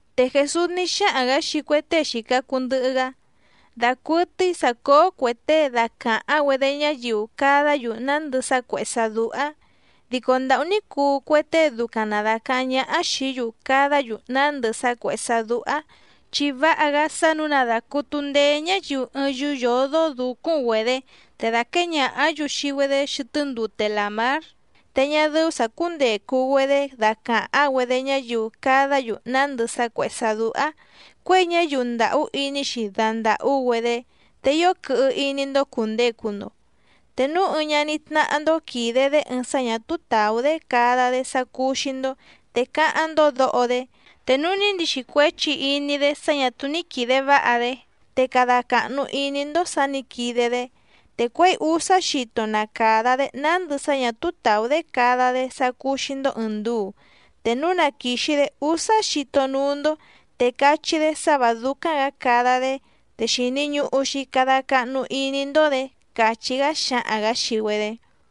Te Jèsús ní xáhaⁿ‑gǎ xii cue tée xìca cuu ndɨhɨ‑gá: —Dacuɨtɨ́í sǎ cóó cuè tée dacàháⁿ‑güedé ñáyiu cadá‑yu nándɨ sá cuèhé sá dúhá, ¡dico ndàhú ní cuu cue tée ducaⁿ na dàcaháⁿ ñáhá xìí‑yu cadá‑yu nándɨ sá cuèhé sá dúhá! Chi váha‑gá sá nǔu na dàcutu ndeé ñáyiu ɨɨⁿ yúú yǒdó dǔcúⁿ‑güedě te dàquée ñàhá‑yu xii‑güedé xɨtɨ́ ndute làmár, te ñá dɨ́ú sǎ cúndècu‑güedé dacàháⁿ‑güedé ñáyiu cadá‑yu nándɨ sá cuèhé sá dúhá, cuěi ñáyiu ndàhú iní‑xi dandàhú‑güedé. Te ío quɨhɨ iní‑ndó cùndecu‑ndo. ’Te núu ɨɨⁿ ñaní tnáhá‑ndó quìde‑dé ɨɨⁿ sá ñà túú tàú‑dé cada‑dé sá cúú‑xí‑ndó te cáháⁿ‑ndó dǒho‑dé, te núu ní ndixi cuéchi iní‑dé sá ñà túú ní quìde váha‑dé, te cada càhnu iní‑ndó sǎ nǐ quide‑dé. Te cuěi úsá xito na càda‑dé nándɨ sá ñà túú tàú‑dé cada‑dé sá cúú‑xí‑ndó ɨ̀ɨⁿ nduu, te núu na quìxi‑dé úsá xito núú‑ndó, te cachí‑dé sá vǎ dúcáⁿ‑gǎ cada‑dé, te xìni ñuhu‑xi cada cahnu iní‑ndó‑dě —càchí‑gá xáhaⁿ‑gǎ xii‑güedé.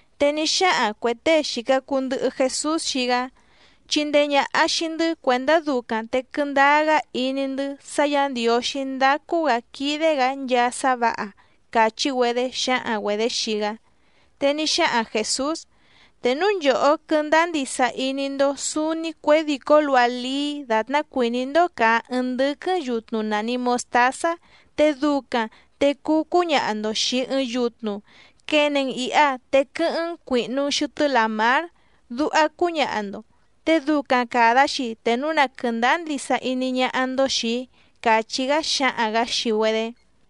Te ní xáhaⁿ cuè tée xìca cuu ndɨhɨ Jesús xii‑gá: —Chindee ñàha xii‑ndɨ́ cuèndá ducaⁿ te quɨndáá‑gá iní‑ndɨ́ sá Yǎ Ndiǒxí ndácú‑gǎ quídé‑gǎ nchaa sá vǎha —càchí‑güedé xǎhaⁿ‑güedě xii‑gá. Te ní xáhaⁿ Jèsús: —Te núu nchòhó quɨ́ndáá ndisa iní‑ndó sǔúní cuědìcó luha lií dàtná cuìní‑ndó càa ɨɨⁿ ndɨ́quɨ́ⁿ yutnu nàni mostázá, te ducaⁿ te cuu cúñaha‑ndo xìi ɨɨⁿ yutnu: “Quene‑n ìha te quɨ́hɨ́ⁿ‑n cuìhnu‑n xɨtɨ́ làmár”, duha cúñaha‑ndo. Te ducaⁿ càda‑xi te núu na quɨ̀ndáá ndisa iní ñáhá‑ndó xìi‑í —càchí‑gá xáhaⁿ‑gǎ xii‑güedé.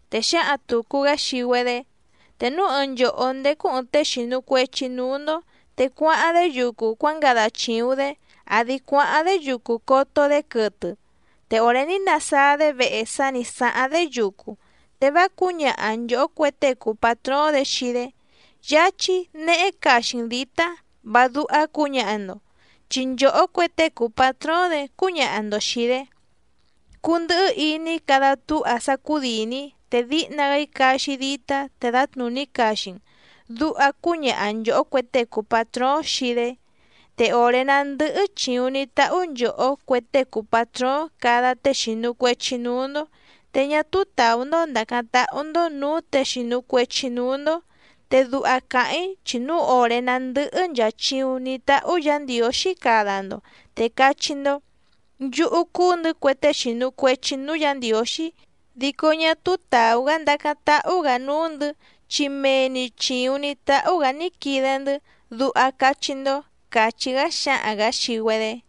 Te xǎhaⁿ tùcu‑gá xii‑güedé: —Te núu ɨɨⁿ nchòhó ndécú ɨ̀ɨⁿ tée xìnu cuechi núú‑ndó, te cuáháⁿ‑dé yucu cuángada chìuⁿ‑dé, àdi cuáháⁿ‑dé yucu coto‑dé quɨtɨ, te òré ní nasáá‑dé vehe sá nǐ sáháⁿ‑dé yucu, te vá cǔñaha nchòhó cue tée cùu patróóⁿ‑dě xii‑dé: “Yáchí nehé caxi‑n dǐtá”, vá dúhá cǔñaha‑ndo. Chi nchòhó cue tée cùu patróóⁿ‑dě cúñaha‑ndo xìi‑dé: “Cundɨhɨ́ iní cada túha sá cúdìni‑í, te díhna‑gá‑í caxi‑í dítá te dǎtnùní caxi‑n”, duha cúñaha nchòhó cue tée cùu patróóⁿ xii‑dé. Te òré ná ndɨ́hɨ́ chìuⁿ ní táhú nchòhó cue tée cùu patróóⁿ cada tée xìnu cuechi núú‑ndó, te ñá túú tàú‑ndó ndàcáⁿ táhú‑ndó nǔú těe xìnu cuechi núú‑ndó. Te duha càháⁿ‑í chi núu òré ná ndɨ̀hɨ nchaa chiuⁿ ní táhú Yǎ Ndiǒxí cada‑ndo, te cachí‑ndó: “Nchúhú cúú‑ndɨ̌ cue tée xìnu cuechi núú Yǎ Ndiǒxí, dico ñá túú tàú‑gá ndacáⁿ táhú‑gǎ núú‑ndɨ̌, chi mee‑ni chìuⁿ ní táhú‑gǎ ní quide‑ndɨ́”, duha cachí‑ndó —càchí‑gá xáhaⁿ‑gǎ xii‑güedé.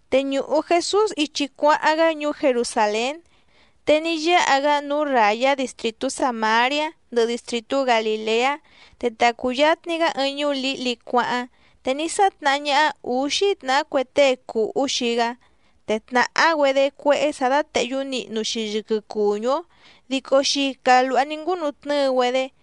Te ñùhu Jesús ichi cuáháⁿ‑gá ñuú Jerusàlén, te ní yáha‑gá núú ràyá distrìtú Sàmariá ndɨhɨ distrìtú Galìleá. Te ta cùyatni‑gá ɨɨⁿ ñuú lǐhli cuáháⁿ, te ní sátnahá ñáhá ǔxí tnàhá cue tée cùhú xii‑gá, te tnàhá‑güedé cuéhé sǎ dátèhyú nihnu‑xi yɨquɨ cùñú‑ó dico xica lùha ní ngúnu tnɨ́ɨ‑güedé,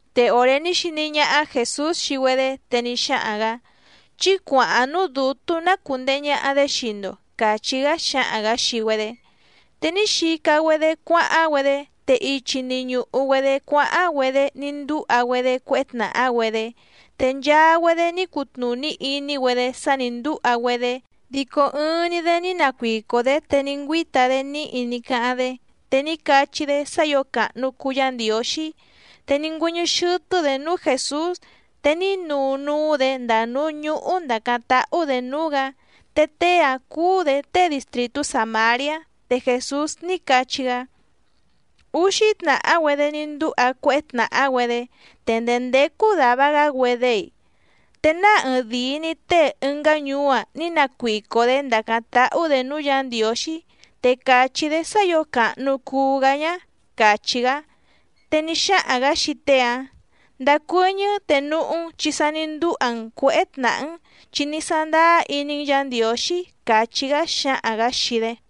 Te òré ní xiní ñáhá Jèsús xii‑güedé, te ní xáhaⁿ‑gǎ: —Chí cuàháⁿ núú dǔtú ná cùndehe ñaha‑dé xii‑ndo —càchí‑gá xáhaⁿ‑gǎ xii‑güedé. Te ní xica‑güedé cuáháⁿ‑güedé, te ichi‑ni ñùhu‑güedé cuáháⁿ‑güedé ní ndúha‑güedé cuéhé tnàhá‑güedé. Te nchaa‑güedé ní cutnùní iní‑güedé sá nǐ ndúha‑güedé, dico ɨɨⁿ‑ni‑dé ní nacuico‑dě, te ní ngüíta‑dé níhi ní cáháⁿ‑dé, te ní cachí‑dé sá ǐo càhnu cuu Yá Ndiǒxí. Te ní ngüɨ́ñɨ́ xɨ́tɨ́‑dě núú Jèsús, te ní nuu núú‑dě ndàa núú ñúhú ndàcáⁿ táhú‑dě núú‑gǎ. Te tée‑áⁿ cúú‑dě tée distrìtú Sàmariá. Te Jèsús ní cachí‑gá: —Úxí tnàhá‑güedé ní ndúha cuéhé tnàhá‑güedé. ¿Te ndèé ndécú dàva‑gá‑güedé‑i? ¿Te náa ɨɨⁿdìi‑ni tée ɨngá ñuú‑a ní nacuico‑dě ndàcáⁿ táhú‑dě núú Yǎ Ndiǒxí, te càchí‑dé sá ǐo càhnu cuu‑gá ñǎ? —càchí‑gá. Te ní xáhaⁿ‑gǎ xii tée‑áⁿ: —Ndacuɨ́ñɨ́ te núhú‑n, chi sa ní ndúha‑n cuěhé tnàhá‑n, chi ní sándáá iní‑n Yǎ Ndiǒxí —càchí‑gá xáhaⁿ‑gǎ xii‑dé.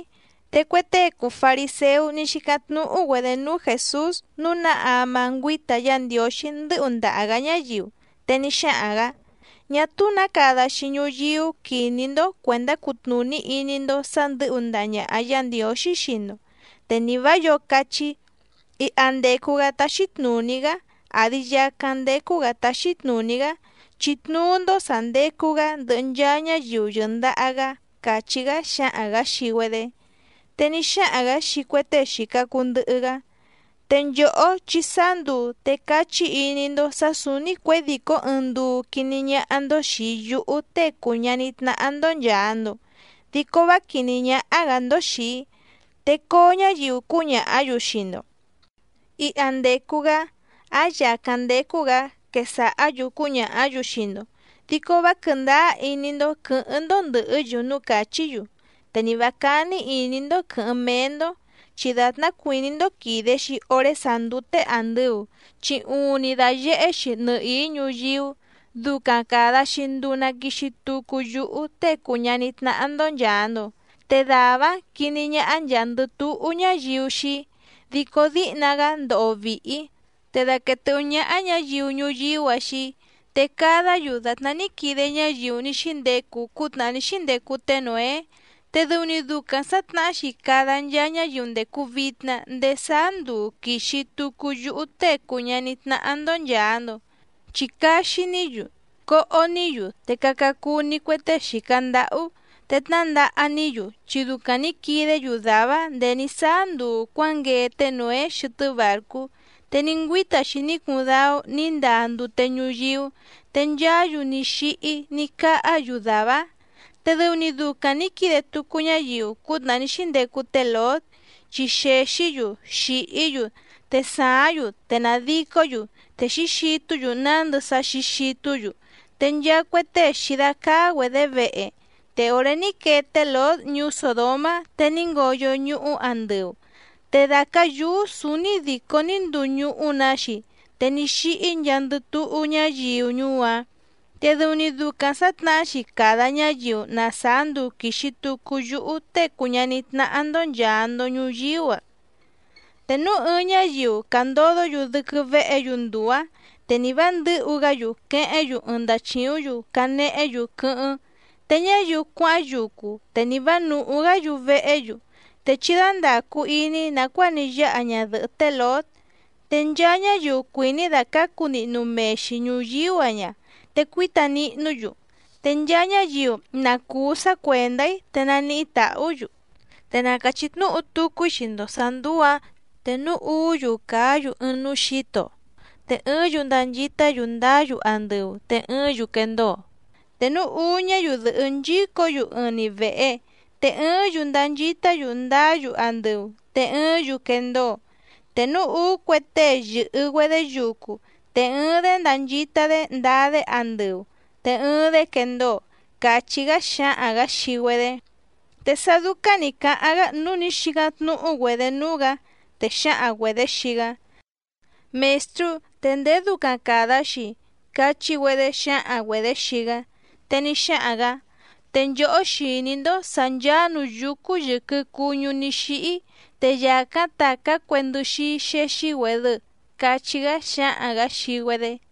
Te cue tée cùu fariséú ní xícáⁿ tnúhú‑güedě núú Jèsús nǔu ná ama ngüíta Yá Ndiǒxí ndɨ́hu ndaha‑gǎ ñáyiu. Te ní xáhaⁿ‑gǎ: —Ñá túú nǎ cada‑xi ñuyíú quiní‑ndó cuèndá cutnùní iní‑ndó sǎ ndɨ̌hu ndaha ñàha Yá Ndiǒxí xii‑ndo. Te ni vǎ yǒo cachí: “Iha ndècu‑gá táxí tnùní‑gá, àdi yacáⁿ ndécú‑gǎ táxí tnùní‑gá”, chi tnuú‑ndó sà ndecu‑gá ndɨhɨ nchaa ñáyiu yɨ̀ndaha‑gá —càchí‑gá xáhaⁿ‑gǎ xii‑güedé. Te ní xáhaⁿ‑gǎ xii cue tée xìca cuu ndɨhɨ‑gá: —Te nchòhó chi sáá nduu, te cachí iní‑ndó sǎ sǔúní cuědìcó ɨɨⁿ nduu quiní ñáhá‑ndó xìi yúhú Tée cùu ñaní tnáhá‑ndó nchàa‑ndo, dico vá quìní ñáhá‑gǎ‑ndó xìi‑í. Te coo ñáyiu cúñàhá‑yu xii‑ndo: “Iha ndècu‑gá, áⁿ yàcáⁿ ndécú‑gǎ”, quesàhá‑yu cúñàhá‑yu xii‑ndo. Dico vá quɨ̀ndáá iní‑ndó quɨ̌hɨ́ⁿ‑ndó ndɨ̀hɨ́‑yu núú càchí‑yu, te ni vǎ cání ìní‑ndó quɨ̌hɨ́ⁿ méé‑ndó. Chi dàtná cuìní‑ndó quìde‑xi oré sàá ndúté àndɨu, chi uuⁿni dàyehé‑xi nɨhìí ñuyíú, ducaⁿ càda‑xi nduu na quixi tucu yúhú Tée cùu ñaní tnáhá‑ndó nchàa‑ndo, te dàvá‑áⁿ quiní ñáhá nchàa‑ndɨ túhú ñáyiu xii‑í. Dico díhna‑gá ndoho vìhi‑í, te daquèe tɨ́hú ñáhá ñǎyiu ñuyíú‑a xii‑í. Te cadá‑yu dàtná ní quide ñáyiu ní xíndecu cútnàhá ní xíndecu té Nǒé, te dɨu‑ni ducaⁿ sǎtnahá‑xi cada nchaa ñáyiu ndècu vitna ndéé sáá nduu quìxi tucu yúhú Tée cùu ñaní tnáhá‑ndó nchàa‑ndo. Chi caxi‑ní‑yu, coho‑ní‑yu, te caca cuu‑ni cue tée xìca ndáhú, te tnǎndaha‑ní‑yu, chi ducaⁿ nǐ quidé‑yu dàvá‑áⁿ nděé ní sáá nduu cuǎnguee té Nǒé xɨtɨ́ bàrcú, te ní ngüíta‑xi ní cuuⁿ dáú nǐ ndaa ndute ñuyíú, te nchaá‑yu ní xíhí ní cáhá‑yu dàvá‑áⁿ. Te dɨu‑ni ducaⁿ nǐ quide tucu ñáyiu cútnàhá ní xíndecu té Lǒt, chi xèxí‑yu xìhí‑yu, te sàáⁿ‑yu te nàdicó‑yu, te xǐxitú‑yu nándɨ sá xǐxitú‑yu, te nchaa cue tée xǐdácáá‑güedě vehe. Te òré ní quee té Lǒt ñuú Sòdomá, te ní ngoyo ñuhú andɨu, te dàcá yúú sǔúní dìcó ní nduu ñuhú‑nǎ‑xi, te ní xíhí nchaandɨ túhú ñáyiu ñuú‑áⁿ. Te dɨu‑ni ducaⁿ sǎtnahá‑xi cada ñáyiu na sàá nduu quìxi tucu yúhú Tée cùu ñaní tnáhá‑ndó nchàa‑ndo ñuyíú‑a. ’Te núu ɨɨⁿ ñáyiu càndodó‑yu dɨ́quɨ́ véhě‑yu nduu‑ǎⁿ, te nì vá ndɨ̌hu‑gá‑yu quehéⁿ‑yu ɨɨⁿ ndachìúⁿ‑yu canehé‑yu quɨ́hɨ́ⁿ, te ñáyiu cuáháⁿ yucu, te nì vá nùhú‑gá‑yu vehé‑yu. Te chí dándàcu iní nàcuáa ní yáha ñadɨ̀hɨ́ té Lǒt. Te nchaa ñáyiu cuìní dàcácu nihnu mee‑xi ñùyíú‑a ña, te cuíta nihnú‑yu, te nchaa ñáyiu na cùú sá cuèndá‑í, te naníhí tàhú‑yu. ’Te na càchí tnúhu tucu‑í xii‑ndo sǎ ndùu‑áⁿ, te núu úú‑yu càa ɨɨⁿ núú xǐto, te ɨɨ́ⁿ‑yu ndanchitá‑yu ndaá‑yu andɨu, te ɨɨ́ⁿ‑yu quendóo. Te núu úú ñáyiu dɨ̀hɨ́ nchícǒ‑yu ɨɨⁿ‑ni vèhe, te ɨɨ́ⁿ‑yu ndanchitá‑yu ndaá‑yu andɨu, te ɨɨ́ⁿ‑yu quendóo. Te núu úú cue tée yɨ̀hɨ‑güedé yucu, te ɨɨⁿ‑dé ndànchita‑dé ndaa‑dé andɨu, te ɨɨⁿ‑dé quendóo —càchí‑gá xáhaⁿ‑gǎ xii‑güedé. Te sá dúcáⁿ nǐ cáháⁿ‑gá nǔu ní xícáⁿ tnúhú‑güedě núú‑gǎ, te xǎhaⁿ‑güedě xii‑gá: —Mèstrú, ¿te ndèé ducaⁿ càda‑xi‑i? —cachí‑güedé xǎhaⁿ‑güedě xii‑gá. Te ní xáhaⁿ‑gǎ: —Te nchòhó xìní‑ndó sǎ ncháá nǔú yúcú yɨ̀quɨ cuñú ní xíhí, te yàcáⁿ tàcá cue ndɨxíí xéxí‑güèdɨ —cachí‑gá xáhaⁿ‑gǎ xii‑güedé.